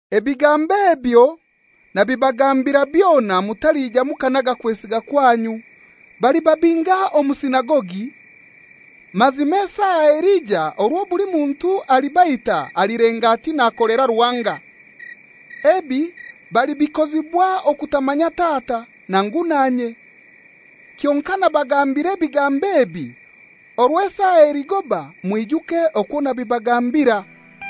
«Ebigambo ebyo nabibagambira byona mutalija mukanaga kwesiga kwanyu. Balibabinga omu sinagogi; mazima esaa elija orwo buli muntu alibaita alilenga ati nakolera Ruhanga. Ebi balibikozibwa okutamanya Tata, nangu nanye. Kyonkai nabagambira ebigambo ebi, orwo esaa eligoba mwijuke okwo nabibagambira.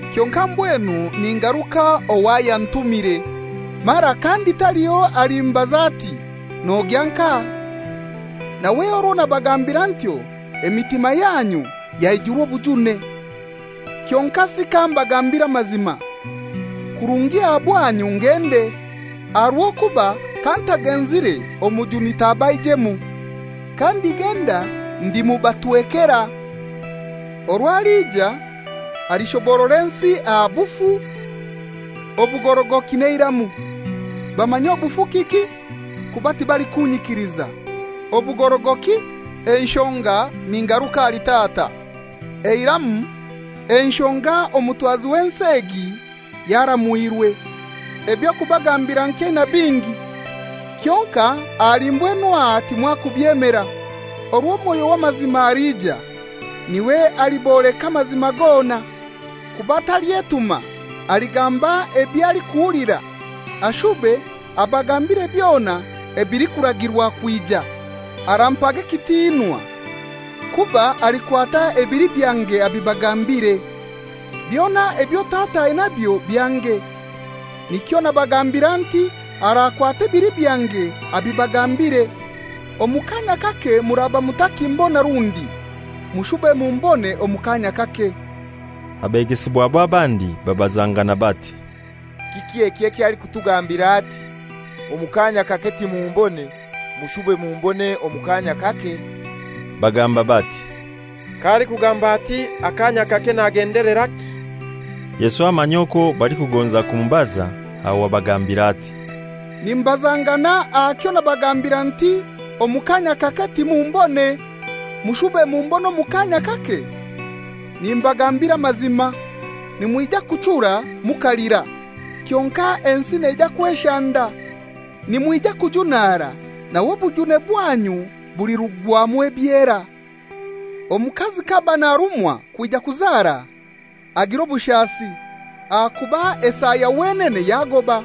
Kyonkai mbwenu ningaruka ow'ayantumire; mara kandi taliho alikumbaza ati, ‹Nogya nkahai?› Nawe orwo nabagambira ntyo emitima yanyu yaijurwa obujune. Kyonkasi kambagambire amazima: Kirungi aha bwanyu ngende, aha rw'okuba kantagenzire Omujuni tabaijemu. Kandigenda ndimubatwekera. Orwo alija, alishoborora ensi aha obufu, obugorogoki n'eiramu. Bamanye obufu kiki kuba tibalikunyikiliza; obugorogoki, enshonga ningaruka ahali Tata; eiramu, enshonga omutwazi w'ensi egi yaramwirwe. «Eby'okubagambira nkyaina bingi, kyonkai ahali mbwenu aha timwakubyemera. Orwo Mwoyo w'amazima alija, n'iwe aliboleka amazima gona, kuba talyetuma, aligamba eby'alikuhulira, ashube abagambire byona ebilikuragirwa kwija. Arampaga ekitinwa, kuba alikwata ebili byange abibagambiire. Byona ebyo Tata ainabyo byange; nikyo nagambira nti arakwata ebili byange abibagambiire. «Omu kaanya kake muraba mutakimbona rundi; mushube mumbone omu kaanya kake.» Abegesibwabe abandi babazangana bati, «Kiki eki eky'alikutugambira ati, ‹Omu kaanya kake timumbone, mushube mumbone omu kaanya kake?›» Bagamba bati, «K'alikugamba ati, ‹Akaanya kake,› nagendeleraki?» Yesu amanya okwo balikugonza kumubaza; aho abagambira ati, «Nimubazangana aha kyo nabagambira nti, ‹Omu kaanya kake timumbone, mushube mumbone omu kaanya kake?› Nimbagambira amazima, nimwija kuchura mukalira, kyonkai ensi neija kweshanda. Nimwija kujunara, nawe obujune bwanyu bulirugwamu ebyera. Omukazi k'aba narumwa kwija kuzara, agira obushasi, ahakuba esaa ya wenene yagoba.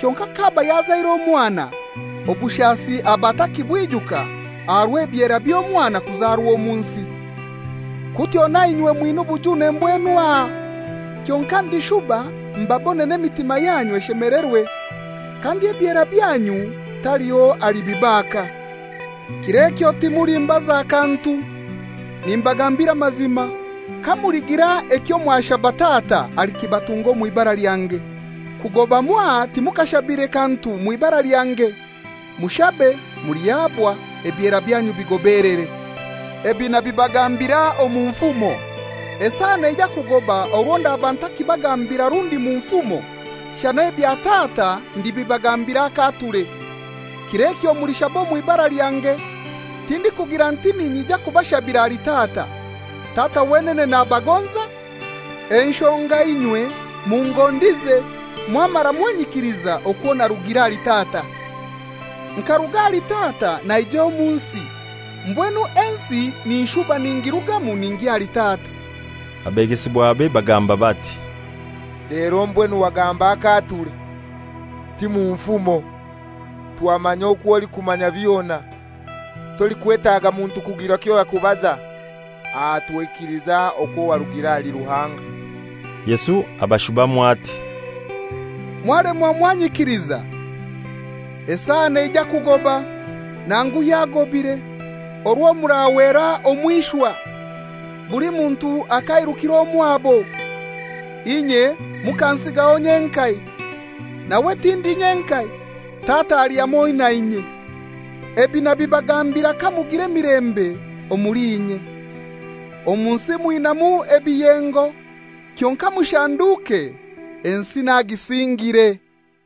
Kyonkai k'aba yazaire omwana, obushasi aba atakibwijuka aha rw'ebyera by'omwana kuzarwa omu nsi. Kutyo nainywe mwina obujune mbwenu aha, kyonkai ndishuba mbabone n'emitima yanyu eshemelerwe, kandi ebyera byanyu taliho alibibaaka. Kir'ekyo timulimbaza kantu. Nimbagambira amazima, kamuligira ekyo mwashaba Tata alikibatunga omw'ibara lyange. Kugoba mwaha timukashabire kantu mw'ibara lyange. Mushabe, mulihabwa; ebyera byanyu bigobelere. «Ebi nabibagambira omu nfumo. Esaa neija kugoba orwo ndaba ntakibagambira rundi mu nfumo, shana ebya Tata ndibibagambira akaature. Kir'ekyo mulishaba omw'ibara lyange; tindikugira nti ninyija kubashabira ahali Tata. Tata wenene nabagonza, enshonga inywe mungondize, mwamara mwanyikiliza okwo narugire ahali Tata. Nkaruga ahali Tata naija omu nsi; mbwenu ensi ninshuba ningirugamu ningya ahali Tata.» Abegesibwabe bagamba bati, «Lero mbwenu wagamba akaature, ti mu nfumo! Twamanya okwo olikumanya byona, tolikwetaaga muntu kugira kyo yakubaza. Aha twaikiliza okwo warugire ahali Ruhanga.» Yesu abashubamu ati, «Mwalemwa mwanyikiliza? Esaa neija kugoba, nangu yagobire, orwo murahwera omw'ishwa, buli muntu akairukira omwabo, inye mukansigaho nyenkai. Nawe tindi nyenkai; Tata ali hamoi nanye. Ebi nabibagambira kamugira emilembe omuli inye. Omu nsi mwinaimu ebiyengo; kyonkai mushanduke! Ensi nagisingire.»